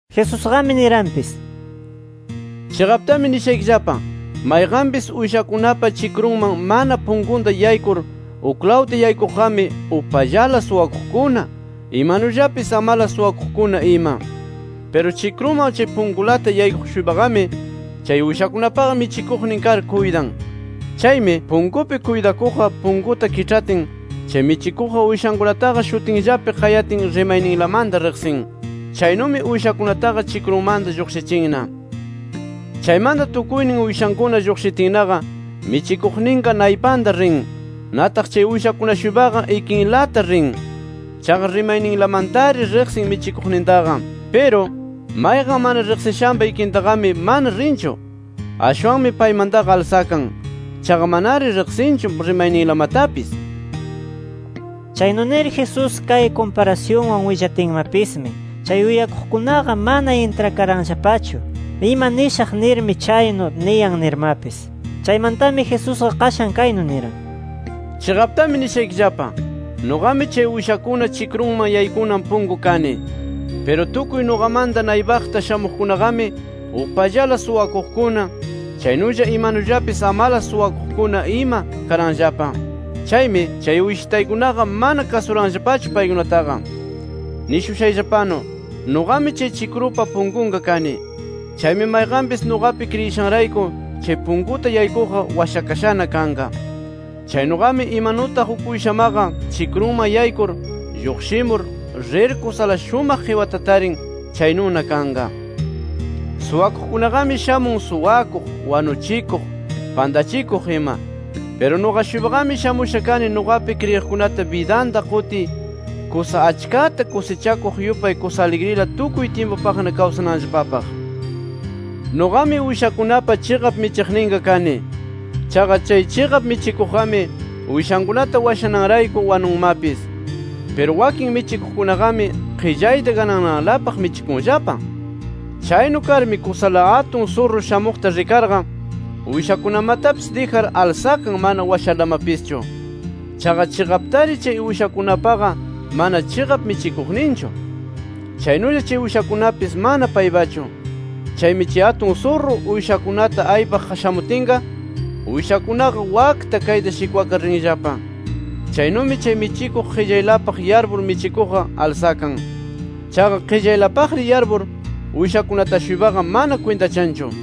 Jesusqami niranpis: “Chiqaptami nishaykillapa: Mayqanpis uyshakunapa chikrunman mana punkunta yaykur uklawta yaykuqqami, upallala suwakuqkuna, imanullapis amalas suwakuqkuna ima. Piru chikruman chay punkunlata yaykuq-shuypaqami, chay uyshakunapaqa michikuqnin kar kuytan. Chaymi, punkupi kuytakuqqa punkuta kiĉhatin, chay michikuqqa uyshankunataqa shutinllapi qayatin, rimayninlamanta riqsin. Chaynumi uyshankunataqa chikrunmanta lluqshichinna. Chaymanta tukuynin uyshankuna lluqshitinnaqa, michikuqninqa naypanta rin. Nataq chay uyshankuna-shuypaqa ikinlata rin. Chaqa rimayninlamantari riqsin michikuqnintaqa. Piru, mayqan mana riqsishanpa ikintaqami mana rinchu. Ashwanmi paymantaqa alsakan. Chaqa manari riqsinchu rimayninlamatapis”. Chaynu nir Jesús kay kumparasyunwan willatinmapismi, chay uyakuqkunaqa mana intrakaranllapachu ima nishaq nirmi chaynu niyan nirmapis. Chaymantami Jesusqa qashan kaynu niran: “Chiqaptami nishaykillapa: Nuqami chay uyshakuna chikrunman yaykunan punku kani. Piru tukuy nuqamanta naypaqta shamuqkunaqami upallala suwakuqkuna, chaynulla imanullapis amalas suwakuqkuna ima karanllapa. Chaymi, chay uyshitaykunaqa mana kasuranllapachu paykunataqa. Nishushayllapanu, nuqami chay chikrunpa punkunqa kani. Chaymi mayqanpis nuqapi kriyishanrayku chay punkuta yaykuqqa washakashana kanqa. Chaynuqami, imanutaq uk uyshamaqa chikrunman yaykur, lluqshimur, rir kusala shumaq qiwata tarin, chaynuna kanqa. “Suwakuqkunaqami shamun suwakuq, wanuchikuq, pantachikuq ima. Piru nuqa-shuypaqami shamusha kani, nuqapi kriyiqkunata bidanta qutiy kusa achkata kusichakuq yupay kusa aligrila tukuy tyimpupaqna kawsananllapapaq. Nuqami uyshakunapa chiqap michiqninqa kani. Chaqa chay chiqap michikuqqami uyshankunata washananrayku wanunmapis. Piru wakin michikuqkunaqami qillayta ganananlapaq michikunllapa. Chaynu karmi kusala atun surru shamuqta rikarqa, uyshakunamatapis dijar alsakan mana washarlamapischu. Chaqa chiqaptaqari chay uyshakunapaqa mana chiqap michikuqninchu. Chaynulla chay uyshakunapis mana paypachu. Chaymi chay atun surru, uyshakunata aypaq shamutinqa, uyshakunaqa wakta kayta shikwakar rinllapa. Chaynumi chay michikuq qillaylapaq yarpur michikuqqa alsakan. Chaqa qillaylapaqri yarpur, uyshakunata-shuypaqa mana kwintachanchu.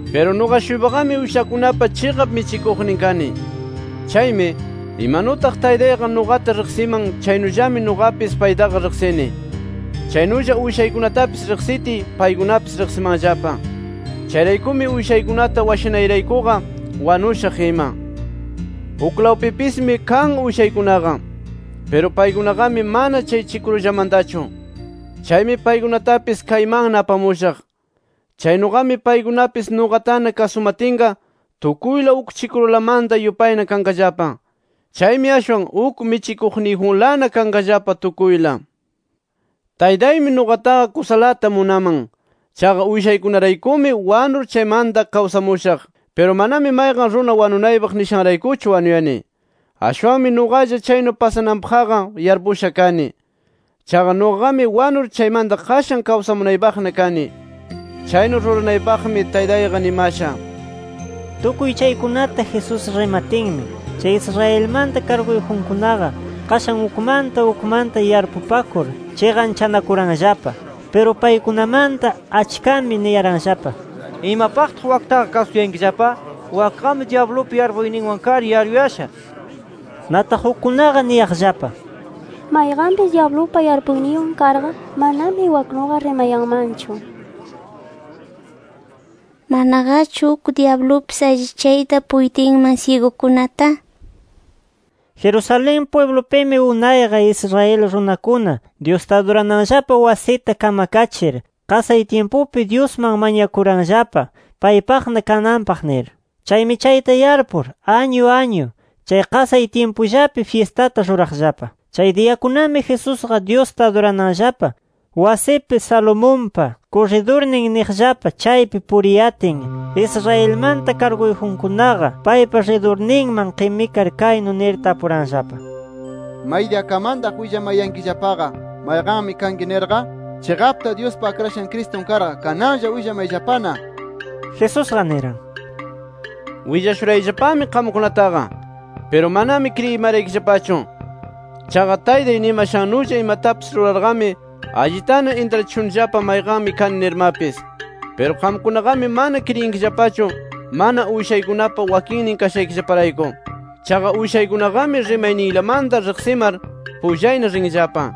“Piru nuqa-shuypaqami uyshakunapa chiqap michikuqnin kani. Chaymi, imanutaq Taytayqa nuqata riqsiman chaynullami nuqapis paytaqa riqsini. Chaynulla uyshaykunatapis riqsitiy, paykunapis riqsimanllapa. Chayraykumi uyshaykunata washanayraykuqa wanushaq ima. Uklawpipismi kan uyshaykunaqa. Piru paykunaqami mana chay chikrullamantachu. Chaymi paykunatapis kaymanna apamushaq. Chaynuqami paykunapis nuqatana kasumatinqa tukuyla uk chikrulamanta yupayna kanqallapa. Chaymi ashwan uk michikuqniyjunlana kanqallapa tukuyla. “Taytaymi nuqataqa kusalata munaman. Chaqa uyshaykunaraykumi wanur, chaymanta kawsamushaq. Piru manami mayqan runa wanunaypaq nishanraykuchu wanuyani. Ashwanmi nuqalla chaynu pasananpaqqa yarpusha kani. Chaqa nuqaqami wanur chaymanta qashan kawsamunaypaqna kani. Chaynu ruranaypaqmi Taytayqa nimasha” nir. Tukuy chaykunata Jesús rimatinmi, chay Israelmanta karguyjunkunaqa, qashan ukmanta ukmanta yarpupakur chiqanchanakuranllapa. Piru paykunamanta achkami niyaranllapa: —¿Imapaqta waktaqa kasuyankillapa? Wakqami dyablupa yarpuyninwan kar yaruyasha, nir. Nataq ukkunaqa niyaqllapa: —Mayqanpis dyablupa yarpuyninwan karqa, manami waknuqa rimayanmanchu. ¿Manaqachu uk dyablupis allichayta puytinman syigukunata? nir. Jerusalén pwiblupimi unayqa, Israel runakuna Dyusta adurananllapa wasita kamkachir, qasay tyimpupi Dyusman mañakuranllapa paypaqna kananpaq nir. Chaymi chayta yarpur añu añu chay qasay tyimpullapi fyistata ruraqllapa. Chay diyakunami Jesusqa Dyusta adurananllapa wasipi, Salomonpa kurridurnin niqllapa chaypi puriyatin, Israelmanta karguyjunkunaqa paypa ridurninman qimikar kaynu nir tapuranllapa: —¿Maydiyakamantaq willamayankillapaqa mayqanmi kanki nirqa? Chiqapta Dyuspa Akrashan Cristun karqa, kananlla willamayllapana nir. Jesusqa niran: —Willashurayllapami qamkunataqa. Piru manami kriyimaraykillapachu. Chaqa Taytay nimashannulla imatapis rurarqami, allitana intrachishunillapa mayqanmi kani nirmapis. Piru qamkunaqami mana kriyinkillapachu, mana uyshaykunapa wakinnin kashaykillaparayku. Chaqa uyshaykunaqami rimanaylamanta riqsimar, pullayna rinllapa.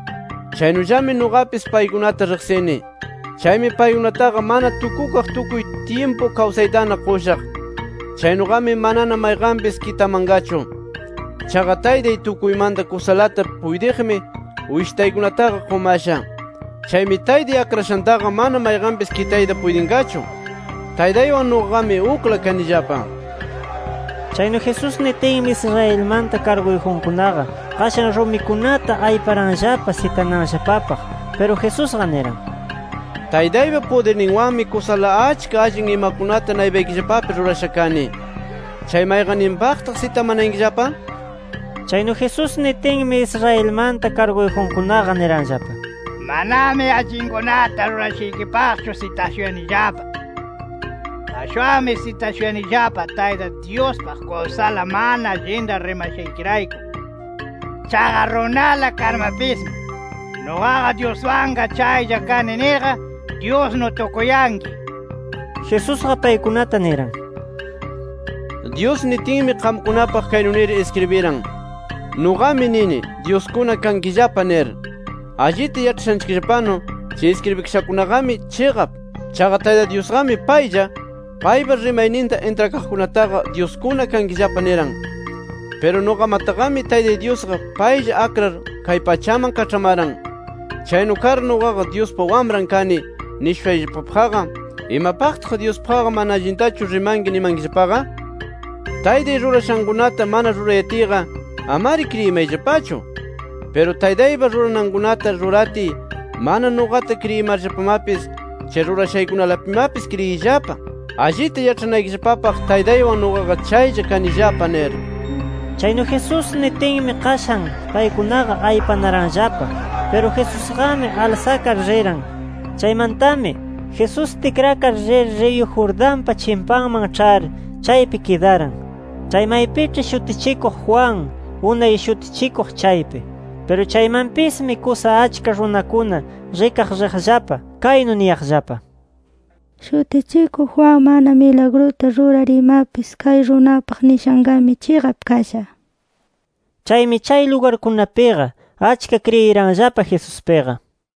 Chaynullami nuqapis paykunata riqsini. Chaymi paykunataqa mana tukukaq tukuy tyimpu kawsaytana qushaq. Chaynuqami manana mayqanpis kitamanqachu. Chaqa Taytay tukuymanta kusalata puytiqmi uyshitaykunataqa qumasha. Chaymi Taytay akrashantaqa mana mayqanpis kitayta puytinqachu. Taytaywan nuqaqami, ukla kanillapa nir. Chaynu Jesús nitinmi, Israelmanta karguyjunkunaqa qashan rumikunata ayparanllapa sitananllapapaq. Piru Jesusqa niran: —Taytaypa pudirninwanmi kusala achka allin imakunata naypaykillapapi rurasha kani. ¿Chay mayqayninpaqtaq sitamanayankillapa? nir. Chaynu Jesús nitinmi, Israelmanta karguyjunkunaqa niranllapa: —Manami allinkunata rurashaykipaqchu sitashuyanillapa. Ashwanmi sitashuyanillapa Tayta Dyuspaq kusala mana allinta rimashaykirayku. Chaqa runala karmapismi ‘Nuqaqa Dyuswanqa chaylla kani’ nirqa Dyusnu tukuyanki nir. Jesusqa paykunata niran: —Dyus nitinmi, qamkunapaq kaynu nir iskribiran: ‘Nuqami nini dyuskuna kankillapa’ nir. Allita yaĉhashanchikllapanu chay iskribikashakunaqami chiqap. Chaqa Tayta Dyusqami paylla, paypa rimayninta intrakaqkunataqa, ‘dyuskuna kankillapa’ niran. Piru nuqamataqami Taytay Dyusqa paylla akrar kay pachaman kaĉhamaran. Chaynu kar nuqaqa Dyuspa Wamran kani nishushayllapapaqqa, ¿imapaqtaq Dyuspaqqa mana allintachu rimanki ninkillapaqa? Taytay rurashankunata mana rurayatiyqa, amari kriyimayllapachu. Piru Taytaypa ruranankunata ruratiy mana nuqata kriyimarllapamapis, chay rurashaykunalapimapis kriyiyllapa, allita yaĉhanaykillapapaq Taytaywan nuqaqa chaylla kanillapa nir. Chaynu Jesús nitinmi, qashan paykunaqa aypanaranllapa. Piru Jesusqami alsakar riran. Chaymantami Jesús tikrakar rir, riyu Jordanpa chimpanman ĉhar chaypi kidaran, chay maypiĉhi Shutichikuq Juan unay shutichikuq chaypi. Piru chaymanpismi, kusa achka runakuna rikaq rirllapa, kaynu niyaqllapa: —Shutichikuq Juan mana milagruta rurar imapis, kay runapaq nishanqami, chiqap kasha nir. Chaymi chay lugarkunapiqa, achka kriyiranllapa Jesuspiqa.